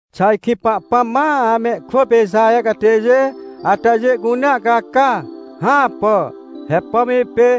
Xà ajkĩ Pahpãm ma amehkwỳ pê Ixaher catêjê atajê cunea caca? Hãpà! He pom ipê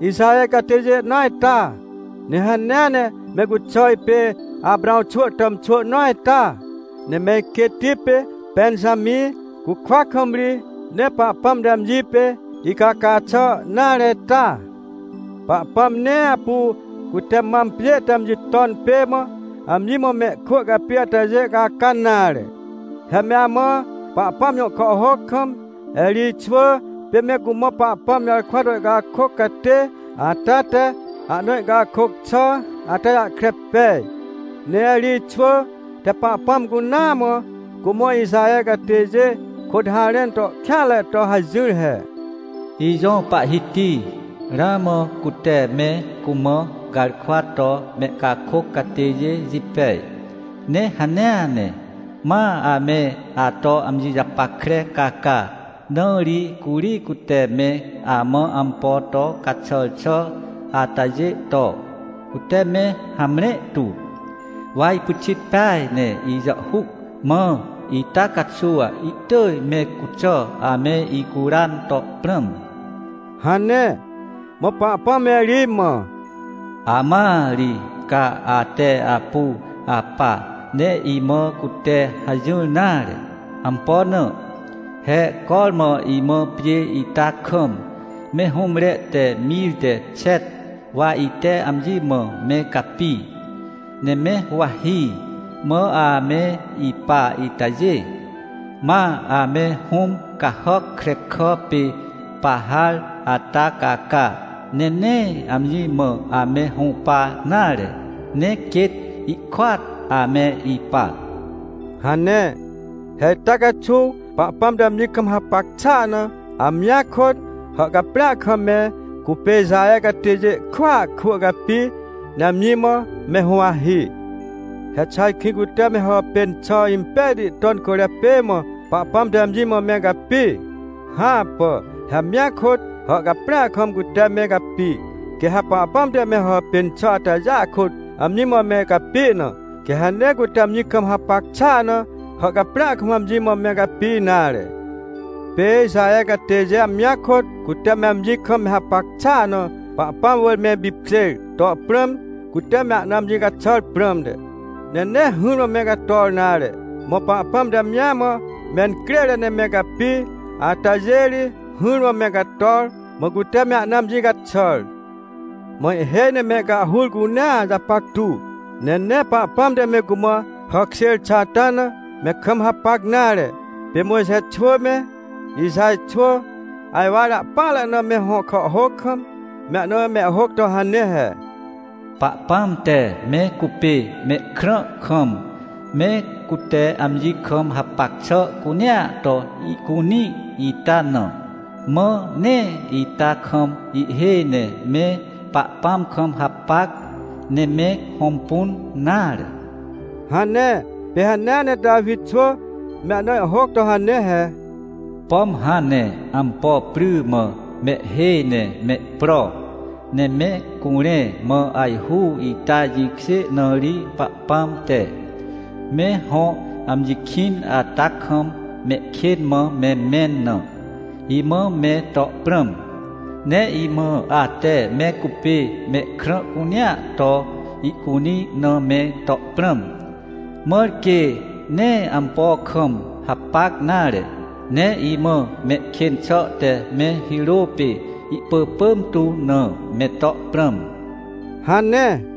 Ixaher catêjê nõa ita? Ne hanea ne me cuxà, ipê Aprãw xwỳ tàmxwỳ nõa ita? Ne me iquêtti pê Pẽnjamĩ cukwa kam ri, nee Pahpãm te amji pê icaca xà nare ita? Pahpãm nee apu cute mam pjê te amji ton pê mã, amji mã mehkwỳ capi atajê caca nare. He me amã, Pahpãm jõ kàhhôc kam, Erij xwỳ pê me cumã Pahpãm jarkwa to ihcakôc catê ata te ahna ihcakôc xà ata jahkre pej. Ne Erij xwỳ te Pahpãm cunaa mã, cumã Ixaher catêjê kôt harẽn to kêanre to hajỹr he: “Ijõ Pahhiti, ramã cute me cumã garkwa to mehcakôc catêjê jipej. Ne hanea ne, ma ame ato amji japackre caca, na ri curi cute me amã ampo to caxàr xà atajê to, cute me hamre tu. Wa ipyxit peaj ne ijàhhuc, mã ita caxuw ihtỳj me cuxà, ame icuran to prãm” hane. Mã Pahpãm Erij mã: “Amãa ri, ca ahte apu apa, ne imã cute hajỹr nare. Ampo na? He cormã imã pjê ita kam, me hũmre te mir te xet wa ite amji mã me capi, ne me huwahi, mã ame ipa itajê, ma ame hũm cahàc krekà pê Pahar ata caca, ne nee amji mã ame hũpa nare, ne quêt ikôat ame ipa” hane. He ita caxuw Pahpãm te amji kam hapac xàa na, amjia kôt, hàhcaprĩa kam me cupê Ixaher catêjê kwỳa kwỳ capi, ne amji mã me huwahi. He xà ajkĩ cute me hàpên xà impejti ton cwỳrjapê mã, Pahpãm te amji mã me capi? Hãpà. He amjia kôt, hàhcaprĩa kam, cute me capi. Quê ha Pahpãm te me hàpên xà atajê kôt amji mã me capi na, quê ha nee cute amji kam hapac xàa na hàhcaprĩa kam amji mã me capi nare. Pê Ixaher catêjê amjia kôt, cute me amji kam me hapac xàa na, Pahpãm wỳr me ipipkjêr to prãm, cute me ahna amji caxàr prãmte, ne nee hỹrmã me cator nare. Mã Pahpãm te amji mã mencrêre ne me capi atajê ri, hỹrmã me cator, mã cute me ahna amji caxàr. Mã ihhêj ne mehcahhur cunea japactu, ne nee Pahpãm te me cumã hàkjêr xà ata na, me kam hapac nare. Pê Mojxe xwỳ me, Ixaj xwỳ, ajwar ahpỹanre na me hõ kàhhôc kam, me ahna mehhôc to hane he: “Pahpãm te me cupê mehkrã kam, me cute amji kam hapac xà cunea to ihcunĩ ita na, mã nee ita kam ihhêj ne me Pahpãm kam hapac, ne me hõmpun nare” hane. Pê hanea ne Tawi xwỳ me ahna ihhôc to hane he: “Pom hãn ne ampo pry mã mehhêj ne mehpro, ne me curẽ, mã ajhu ita jĩkjê na ri Pahpãm te, me hõ amji kĩn ata kam mehkên mã me mẽn na, imã me to prãm. Ne imã ate me cupê mehkrã cunea to ihcunĩ na me to prãm, mãr quê nee ampo kam hapac nare. Ne imã mehkên xà te me hirô pê ihpỳpỳm tu na, me to prãm” hane.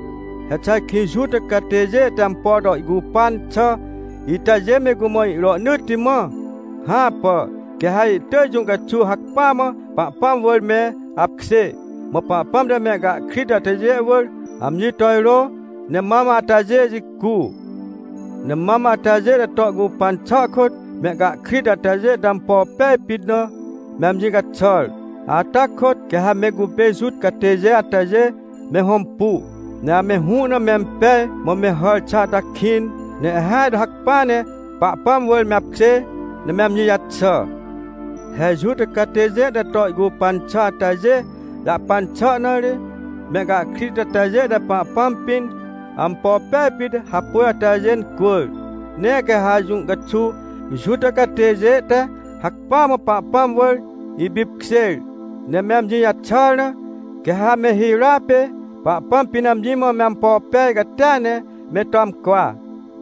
He xà ajkĩ Juta catêjê te ampo to ihcupan xà itajê me cumã irohnỳtti mã? Hãpà. Quê ha ihtỳj jũ caxuw hacpỹa mã Pahpãm wỳr me apkjê. Mã Pahpãm te mehcahkrit atajê wỳr amji to irô, ne mam atajê jicu. Ne mam atajê te to ihcupan xà kôt, mehcahkrit atajê te ampo pej pit na, me amji caxàr. Ata kôt quê ha me cupê Juta catêjê atajê, me hõmpu, ne ame hũ na mempej mã me hàr xà ata kĩn, ne ihhêaj to hacpỹa ne Pahpãm wỳr me apkjê, ne me amji jaxà. He Juta catêjê te to ihcupan xà atajê jahpan xà na ri, mehcahkrit atajê te Pahpãm pĩn, ampo pej pit hapôj atajê incwỳr. Ne quê ha jũ caxuw Juta catêjê te hacpỹa mã Pahpãm wỳr ipipkjêr, ne me amji jaxàr na, quê ha me hirôa pê Pahpãm pĩn amji mã me ampo pej catia ne me to amcwa.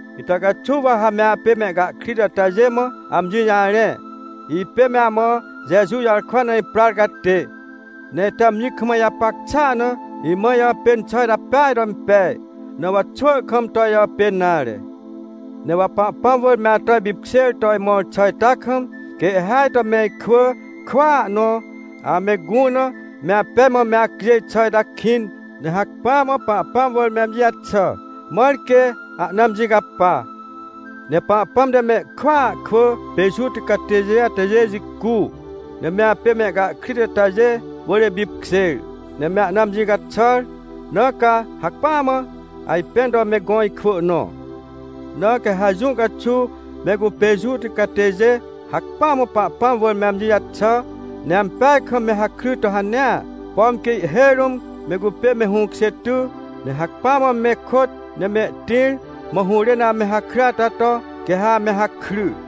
Ita caxuw wa ha me apê mehcahkrit atajê mã amji jarẽ. Ipê me amã Jeju jarkwa na iprar catê. Ne ite amji kam ijapac xàa na, imã ijàpên xà ita peaj to impej, na wa xwỳ kam to ijàpên nare. Ne wa Pahpãm wỳr me ato ipipkjêr to imõr xà ita kam, quê ihhêaj to me ikwỳ kwỳa nõ, ame gũ na me apej mã me acjêj xà ita kĩn, ne hacpỹa mã Pahpãm wỳr amji jaxà, mãr quê ahna amji capa. Ne Pahpãm te mehkwỳa kwỳ pê Juta catêjê atajê jicu, ne me apê mehcahkrit atajê wỳr ipipkjêr, ne me ana amji caxàr, na ca hacpỹa mã ajpẽn to me gõ ikwỳ nõ. Na quê ha jũ caxuw me cupê Juta catêjê hacpỹa mã Pahpãm wỳr me amji jaxà, ne ampeaj kam me hakry to hanea, pom quê ihhêj rũm me cupê me hũkjê ty, ne hacpỹa mã me kôt ne mehtĩr, mã hũrên ame hakry ata to, quê ha ame hakry.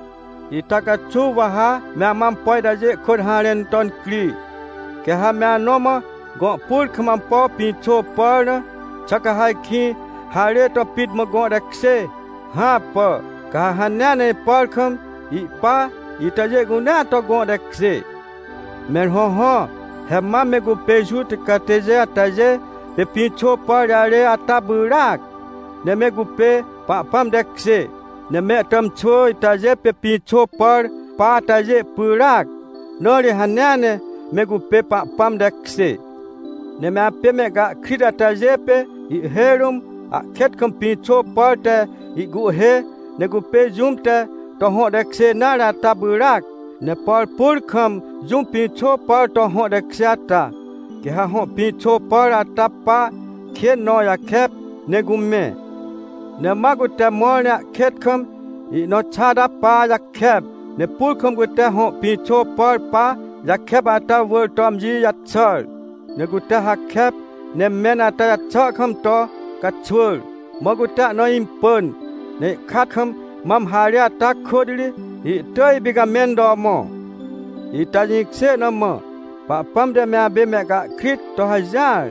Ita caxuw wa ha me amã ampo itajê kôt harẽn to incri. Quê ha me anõ mã gõ pur kam ampo pĩxô pàr na, xà ca ha ajkĩ harê to pit mã gõ tekjê? Hãpà, ca ha hanea ne ipàr kam ihpa itajê cunea to gõ tekjê. Mẽr hõhõ, he mam me cupê Juta catêjê atajê pê pĩxô pàr jarê ata pyràac, ne me cupê Pahpãm tekjê, ne mehtàmxwỳ itajê pê pĩxô pàr pa atajê pyràac, na ri hanea ne me cupê Pahpãm tekjê. Ne me apê mehcahkrit atajê pê, ihhêj rũm ahkêt kam pĩxô pàr te ihcuhhê, ne cupê jũm te to hõ tekjê nare ata pyràac. Ne por pur kam jũm pĩxô pàr to hõ tekjê ata, quê ha hõ pĩxô pàr ata pa kên nõ jakep, ne cumẽ. Ne ma cute mõr ne ahkêt kam ihnõ xa ata pa jakep, ne pur kam cute hõ pĩxô pàr pa jakep ata wỳr to amji jaxàr, ne cute hakep, ne mẽn ata jaxà kam to caxwỳr. Mã cute ahna impỳn, ne ihkat kam mam harê ata kôt ri, ihtỳj ipicamẽn to mõ. Ita jĩkjê na mã, Pahpãm te me apê mehcahkrit to hajỹar,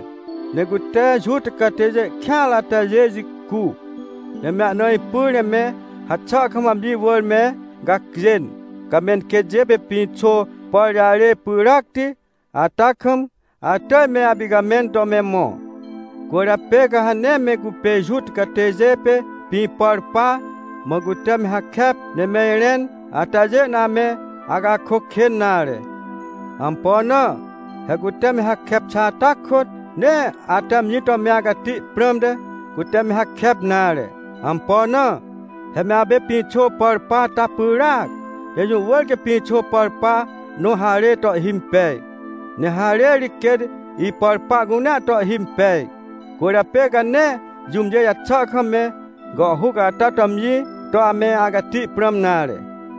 ne cute Juta catêjê kêanre atajê jicu, ne me ana ipyr ne me haxà kam amji wỳr me gacjên. Ca menquêtjê pê pĩxô pàr jarê pyràcti ata kam, atỳj me apicamẽn to me mõ. Cwỳrjapê ca ha nee me cupê Juta catêjê pê pĩ pàr pa, mã cute me hakep ne me irẽn atajê na ame acakôc kên nare. Ampo na? He cute me hakep xà ata kôt, nee ate amji to me acati prãmte, cute me hakep nare. Ampo na? He me apê pĩxô pàr pa ata pyràac, ne jũ wỳr quê pĩxô pàr pa nõ harê to ihhimpej, ne harê ri quêt ipàr pa cunea to ihhimpej. Cwỳrjapê ca nee jũmjê jaxà kam me gàhhuc ata to amji to ame acati prãm nare.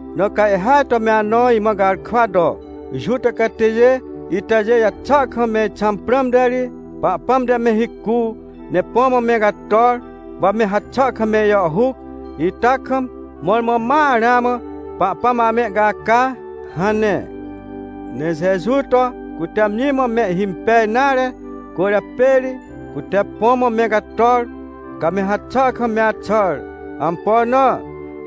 Na ca ihhêaj to me anõ imã garkwa to: — Juta catêjê itajê jaxà kam me ixãm prãmte ri, Pahpãm te me hicu, ne põ mã me cator, wa me haxà kam me ijàhhuc ita kam, mõrmõ ma ramã Pahpãm amehcaca — hane. Ne Jeju to cute amji mã mehhimpej nare cwỳrjapê ri, cute põ mã me cator, ca me haxà kam me axàr. Ampo na?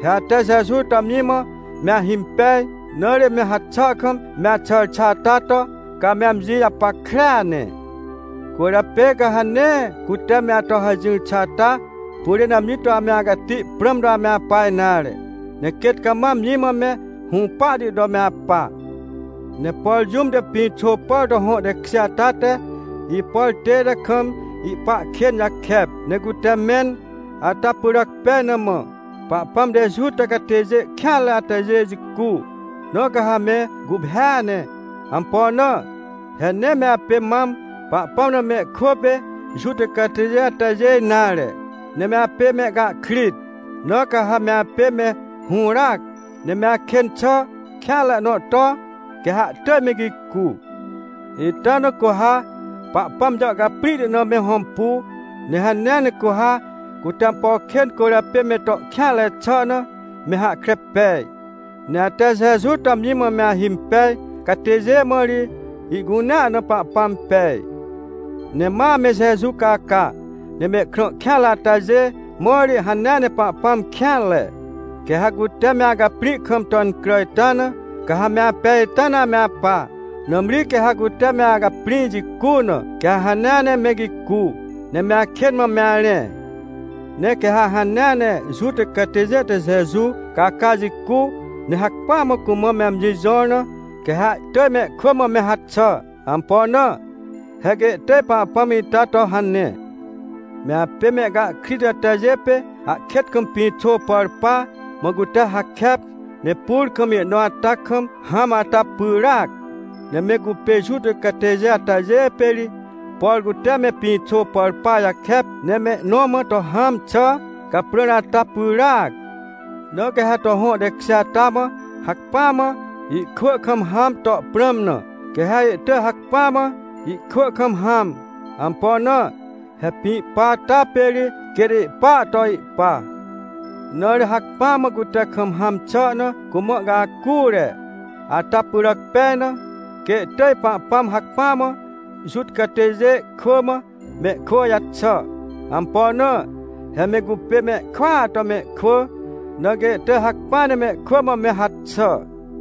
He ate Jeju to amji mã me ahimpej, na ri me haxà kam me axàr xà ata to, ca me amji japackrea ne. Cwỳrjapê ca ha nee cute me ato hajỹr xà ata pyrên amji to ame acati prãm to me apa nare, ne quêt cama amji mã me hũpahti to me apa. Ne por jũm te pĩxô pàr to hõ tekjê ata te ipàr tête kam ihpa kên jakep, ne cute mẽn ata pyràc pej na mã, Pahpãm te Juta catêjê kêanre atajê jicu. Na ca ha me guphêa ne. Ampo na? He nee me apê mam Pahpãm na mehkwỳ pê Juta catêjê atajê nare, ne me apê mehcahkrit. Na ca ha me apê me hũràac, ne me akên xà kêanre nõ to, quê ha ihtỳj me gicu. Ita na cu ha Pahpãm jàhcaprĩhti na me hõmpu, ne hanea ne cu ha, cute ampo kên cwỳrjapê me to kêanre xà na, me hahkre pej. Ne ate Jeju to amji mã me ahimpej catêjê mã ri, ihcunea na Pahpãm pej. Ne ma ame Jeju caca, ne mehkrã kêanre atajê mã ri, hanea ne Pahpãm kêanre. Quê ha cute me acaprĩ kam to incrà ita na, ca ha me apej ita na ame apa. Nãmri quê ha cute me acaprĩ jicu na, quê ha hanea ne, me gicu ne me akên mã me arẽ. Ne quê ha hanea ne Juta catêjê te Jeju caca jicu, ne hacpỹa mã cumã me amji jõr na, quê ha ihtỳj mehkwỳ mã me haxà. Ampo na? He quê ihtỳj Pahpãm ita to hane. Me apê mehcahkrit atajê pê ahkêt kam pĩxô pàr pa, mã cute hakep, ne pur kam ihnõ ata kam hãm ata pyràac. Ne me cupê Juta catêjê atajê pê ri, por cute me pĩxô pàr pa jakep, ne me ihnõ mã to hãm xà caprãr ata pyràac. Na quê ha to hõ tekjê ata mã hacpỹa mã ihkwỳ kam hãm to prãm na, quê ha ihtỳj hacpỹa mã ihkwỳ kam hãm. Ampo na? He pĩ pa ata pê ri quêt ihpaa to ihpa. Na ri hacpỹ mã cute kam hãm xà na cumã ihcacure. Ata pyràc pej na, quê ihtỳj Pahpãm hacpỹa mã Juta catêjê kwỳ mã mehkwỳ jaxà. Ampo na? He me cupê mehkwỳa to mehkwỳ, na quê ihtỳj hacpỹa ne mehkwỳ mã me haxà.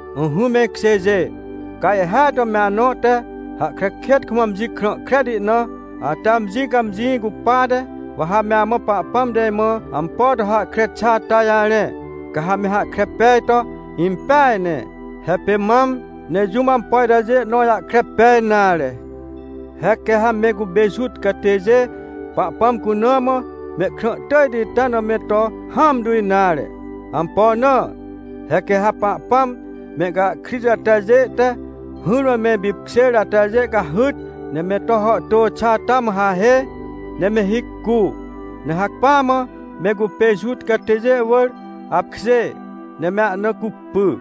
Ỹhỹ me ikjêjê, ca ihhêaj to me anõ te, hahkre kêt kam amji krã kreti na, ate amji cãmjĩ cupate, wa ha me amã Pahpãm te imã ampo to hahkre xà ata jarẽ, ca ha me hahkre pej to impeaj ne. He pê mam, nee jũm ampo itajê nõ jahkre pej nare. He quê ha me cupê Juta catêjê, Pahpãm cuna mã mehkrã tỳjti ita na me to hãmtu nare. Ampo na? He quê ha Pahpãm mehcahkrit atajê te hỹrmã me ipipkjêr atajê cahyt, ne me to hàhtô xà ata mã hahê, ne me hicu. Ne hacpỹa mã me cupê Juta catêjê wỳr apkjê, ne me ahna cupy.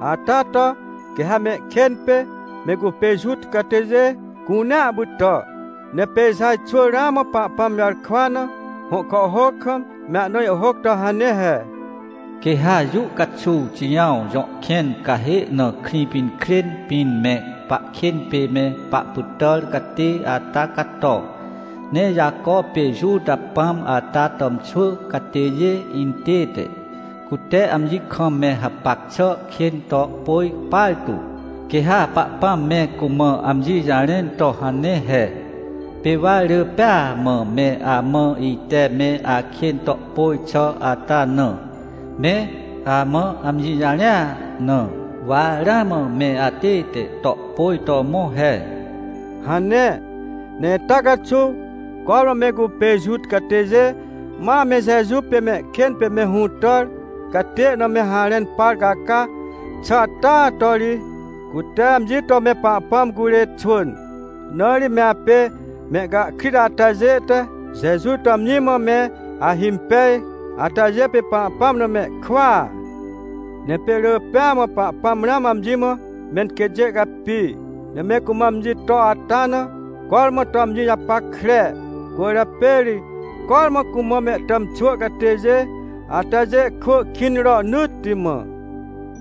Ata to, quê ha mehkên pê, me cupê Juta catêjê cunea pytà. Ne pê Ixaj xwỳ ramã Pahpãm jarkwa na, hõ kàhhôc kam, me ahna ihhôc to hane he: “Quê ha jũ caxuw Xijãw jõ kẽn cahê na Krĩpinkrên pĩn me pahkên pê me pahpytàr catê ata cato, ne Jaco pê Juta pãm ata tàmxwỳ catêjê intête, cute amji kam me hapac xà kên to pôj partu. Quê ha Pahpãm me cumã amji jarẽn to hane he: ‘Pê wa rỳ pêa mã me amã ite me akên to pôj xà ata na, me amã amji jarẽa na, wa ramã me atête to pôj to mõ he’” hane. Ne ita caxuw, cormã me cupê Juta catêjê ma ame Jeju pê mehkên pê me hũtàr catê na me harẽn par caca xà ata to ri, cute amji to me Pahpãm curê xwỳn. Na ri me apê mehcahkrit atajê te Jeju to amji mã me ahimpej atajê pê Pahpãm na mehkwỳa. Ne pê rỳ pêa mã Pahpãm ramã amji mã menquêtjê capi, ne me cumã amji to ata na, cormã to amji japackre. Cwỳrjapê ri cormã cumã mehtàmxwỳ catêjê atajê kwỳ kĩn rohnỳtti mã.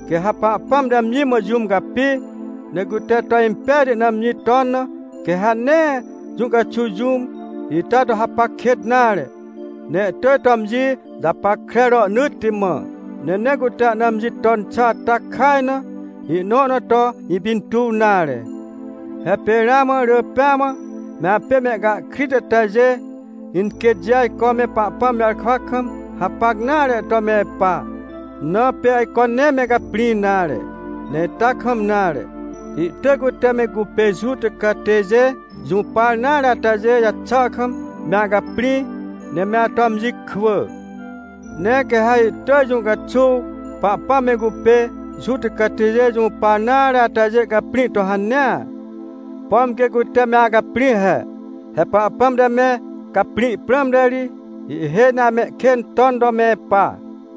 Quê ha Pahpãm te amji mã jũm capi, ne cute to impejti na amji ton na, quê ha nee jũ caxuw jũm ita to hapac kêt nare, ne ihtỳj to amji japackre rohnỳtti mã. Ne nee cute ahna amji ton xà ata kaj na, ihnõ na to ipintuw nare. He pê ramã rỳ pêa mã, me apê mehcahkrit atajê inquêtjê ajco me Pahpãm jarkwa kam hapac nare to me ipa. Na pê ajco nee me caprĩ nare. Ne ita kam nare. Ihtỳj cute me cupê Juta catêjê jũpar nare atajê jaxà kam me acaprĩ, ne me ato amji kwỳ. Ne quê ha ihtỳj jũ caxuw Pahpãm me cupê Juta catêjê jũpar nare atajê caprĩ to hanea, pom quê cute me acaprĩ he. He Pahpãm te me caprĩ prãmte ri, ihhêj ne amehkên ton to me ipa.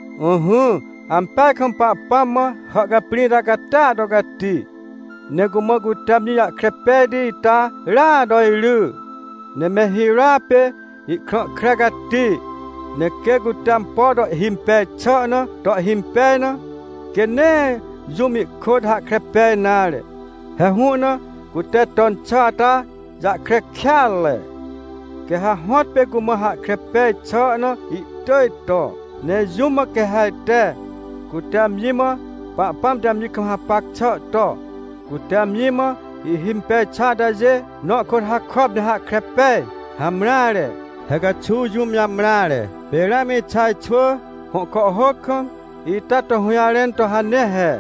Ỹhỹ, ampeaj kam Pahpãm mã hàhcaprĩ ita catia to cati! Ne cumã cute amji jahkre pejti ita rya to iry! Ne me hirôa pê ihkrã kre cati! Ne quê cute ampo to ihhimpej xà na to ihhimpej na, quê nee jũm ihkôt hahkre pej nare. He hũ na cute ton xà ata jahkre kêatre. Quê ha hõtpê cumã hahkre peaj xà na ihtỳj to. Ne jũm mã quê ha ajte, cute amji mã Pahpãm te amji kam hapac xà to, cute amji mã ihhimpej xà atajê nõ kôt hakop ne hahkre pej? Hamreare, he caxuw jũm jamreare. Pê ramã Ixaj xwỳ hõ kàhhôc kam, ita to hũjarẽn to hane he: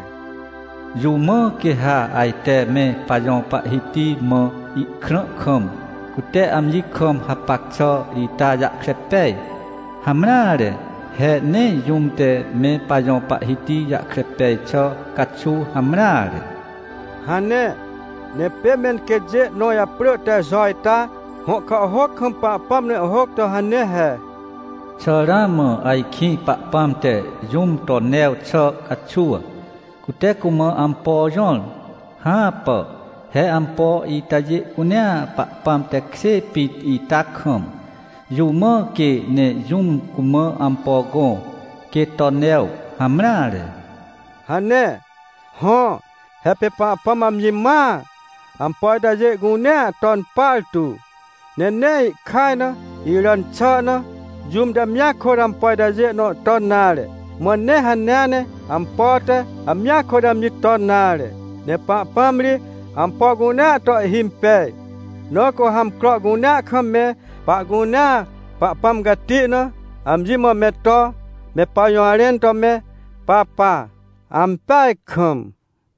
“Jũm mã quê ha ajte me pajõ Pahhiti mã ihkrã kam, cute amji kam hapac xà ita jahkre pej? Hamreare! He nee jũm te me pajõ Pahhiti jahkre pej xà caxuw hamreare” hane. Ne pê me iquêtjê nõ japrỳ te Jo ita, hõ kàhhôc kam Pahpãm na ihhôc to hane he: “Xà ramã ajkĩ Pahpãm te jũm to new xà caxuw, cute cumã ampo jõr? Hãpà! He ampo itajê cunea Pahpãm tekjê pit ita kam, jũ mã quê ne jũm cumã ampo gõ, quê to new? Hamreare!” hane. Hõ, he pê Pahpãm amji mãa, ampo itajê cunea ton partu. Ne nee ihkaj na, iràn xà na, jũm te amjia kôt ampo itajê nõ ton nare. Mã nee hanea ne ampo te, amjia kôt amji ton nare. Ne Pahpãm ri ampo cunea to ihhimpej. Na cu ha amcro cunea kam me pahcunea Pahpãm cati na amji mã me to, me pajũjarẽn to me papa! Ampeaj kam!